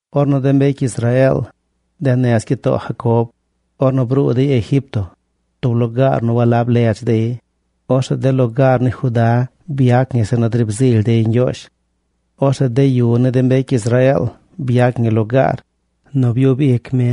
Ornu de mbecy Israeel, de nez gyitoo Jacob, ornu bruu dey Egipto, tub lugaar nu walab ledz dey, orzeꞌ de lugaar ni Juda byac ñi zeꞌ nu driib zily dey Ñgyoozh. Orzeꞌ de yu ni de mbecy Israeel byac ñi lugaar nu briib ic mi.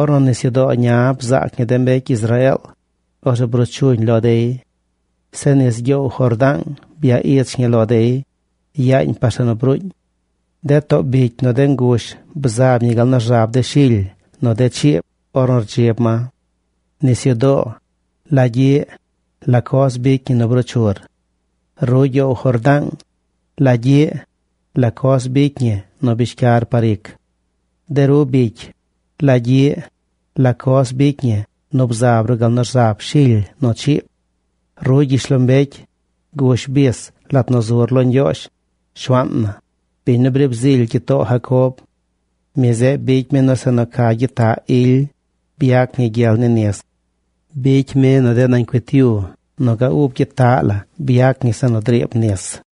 Ornu Nisyudoo Ña bzaac ñi de mbecy Israeel, orzeꞌ bruu chuñ lo dey. Zeꞌ nis ni gyoow Jordaang bya ich ñi lo dey, yaañ par zeꞌ nu bruuñ. De too bicy nu de ngush bzab ñi gal nu rzab de shily nu de chiib ornu rdzib ma. Nisyudoo, ¿la gyiꞌ, la coz bicy ñi nu bruu chur? Ru gyoow Jordaang, ¿la gyiꞌ, la coz bicy ñi nu bishcyar par ic? De ru bicy, ¿la gyiꞌ, la coz bicy ñi nu bzab ru gal nu rzab shily nu chiib? Ru, gyishlombecy, gush bis lat nu zur lo Ñgyoozh, Shuaan na, biñ nu briib zily gyitoo Jacob. Mi zeꞌ bicy mi nu zeꞌ nu ca gyitaꞌ ily byac ñi gyel ni nis. Bicy mi nu de nañ cuit yu nu ga ub gyitaꞌ la byac ñi zeꞌ nu driib nis.